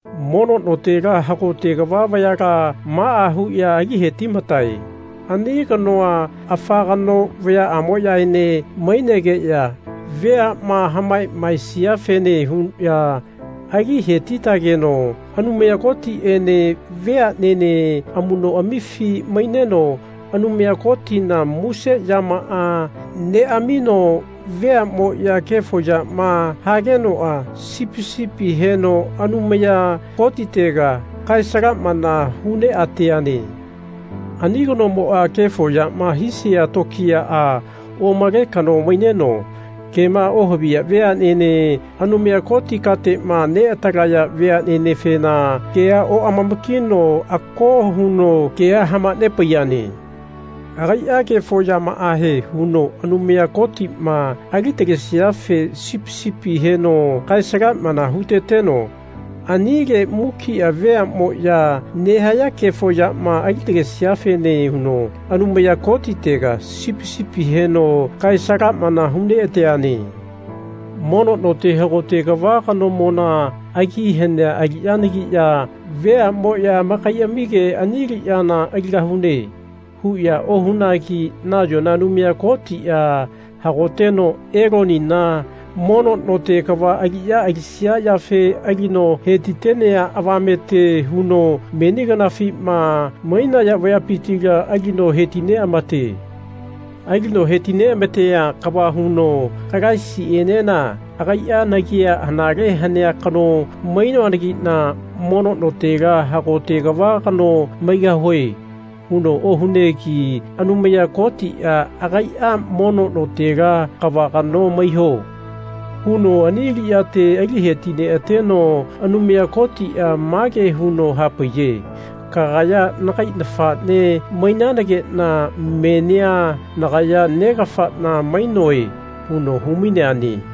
Mono notela hagote kava vayala maa huya ali hetimatae. Ani kanoa afa kano vayaamoyaene mainegeya veama hamamaesiafene huya ali hetitageno Anumaya Kotiene veanene amunoamifi maineno Anumaya Kotina muse yamaa neamino veamoya kefo yama hagenoa sipi sipi heno Anumaya Kotitega kae-salamana hu neateane. Ani kanomoa kefo yama hisia tokiyaa omale kano maineno kema ohaviya veanene Anumaya Koti katema neatalaya veanenefena kea oamama-kino ako huno kea hamanepaiyane. Agaia kefo yamaahe huno Anumaya Kotima ali-talesiafe sipi sipia heno kae-salamana huteteno anile mukia veamoya nehaya kefo yama alitalesiafene huno Anumaya Kotitega sipi sipia heno kae-salamana hu neateane. Mono note hagote kava kanomona agi hanea aliyanagiya veamoya amakaiamige Ani aliyana aligahune. huya ohunagi nayona Anumaya Kotia hagoteno Elonina mono note kava aliya alisia yafe alino hetitenea avamete huno meni kanafima mainaya vayapitila alino heti neamate. Alino hetineamatea kava huno Kalaisienena agaia Nagia anale hanea kano mainoanagina mono notela hagote kava kano maigahue. huno ohunegi Anumaya Kotia agaia Mono notela kava kano maiyo. huno ani aliyate aliheti neateno Anumaya Kotia mage huno hapaiye Kagaya nagai nafane mainanagena menia nagaya Negafana mainoe. huno humaineane.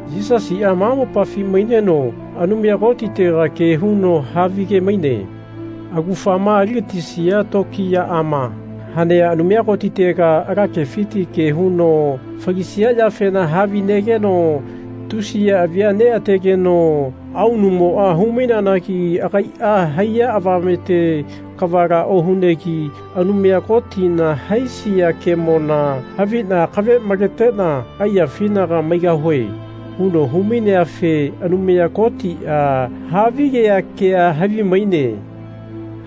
Yisasia ma mopafi maineno Anumaya Kotitega ke huno havige-maine. Augafama aligatisia tokiyaama hanea Anumaya Kotitega ala kefiti ke huno falisia yafena havinegeno tusiya avia neategeno aunumoa hu-maineanagi agaia haiya avamete kavala ohunegi Anumaya Kotina haisia kemona havina akave maletena aiyafinaga maigahue. huno hu-maineafe Anumaya Kotia havigea kea havimaine.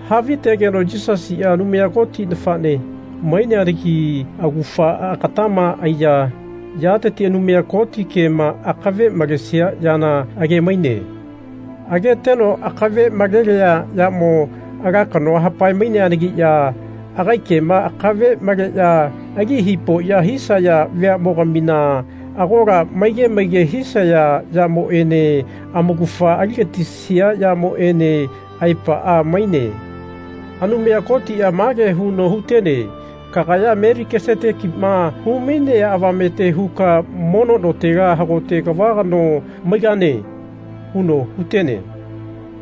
Havitegeno Yisasia Anumaya Koti nafane maineanagi augafa agatama aiya yateti Anumaya Koti kema akave malesia yana age-maine. Ageteno akave malelea yamo ala kanoa hapae-maineanagiya agai kema akave maleya ali hipoya hisaya veamogamina agola maige maige hisaya yamoene amaugafa aligatisia yamoene aepaa maine. Anumaya Kotia mage huno hutene Kagaya Melikisetekima humainea avamete huka mono notela hagote kava kano maigane. huno hutene.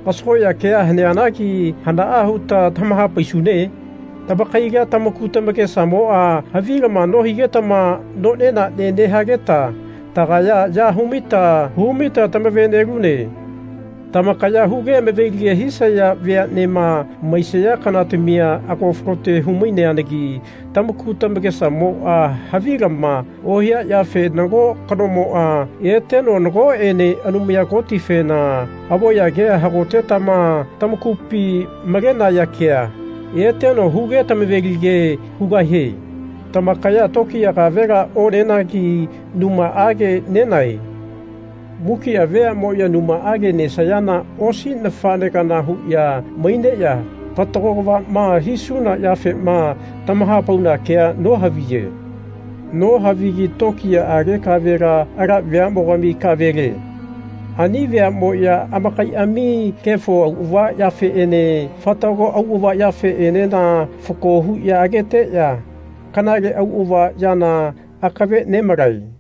Kasagoya kea haneanagi hanaa huta tamahapaisune? Tamakaila tamaku tamakesamoa havilama nohigetama none nane nehageta tagaya ya humaita humaita tamave-nelune. Tamakaya huge amavelige hisaya veanema maisaya kanatamia ago falote hu-maineanagi tamaku tamakesamoa havilama ohia yafe nago kanomoa eteno nagoene Anumaya Kotifena avoya kea hagotetama tamakupi malenaya kea eteno huge tamave-lige hugahie. Tamakaya tokiya kavela onenagi numaage nenae. Mukia veamoya numaage nesayana osi nafane kana huya maineya fatago kavama hisuna yafema tamahapauna kea nohaviye. Nohavigi tokiyaage kavela ala veamogami kavele. Ani veamoya amakaiami kefo auava yafeene fatago auava yafeenena fako huya ageteya kanale auava yana akave nemalae.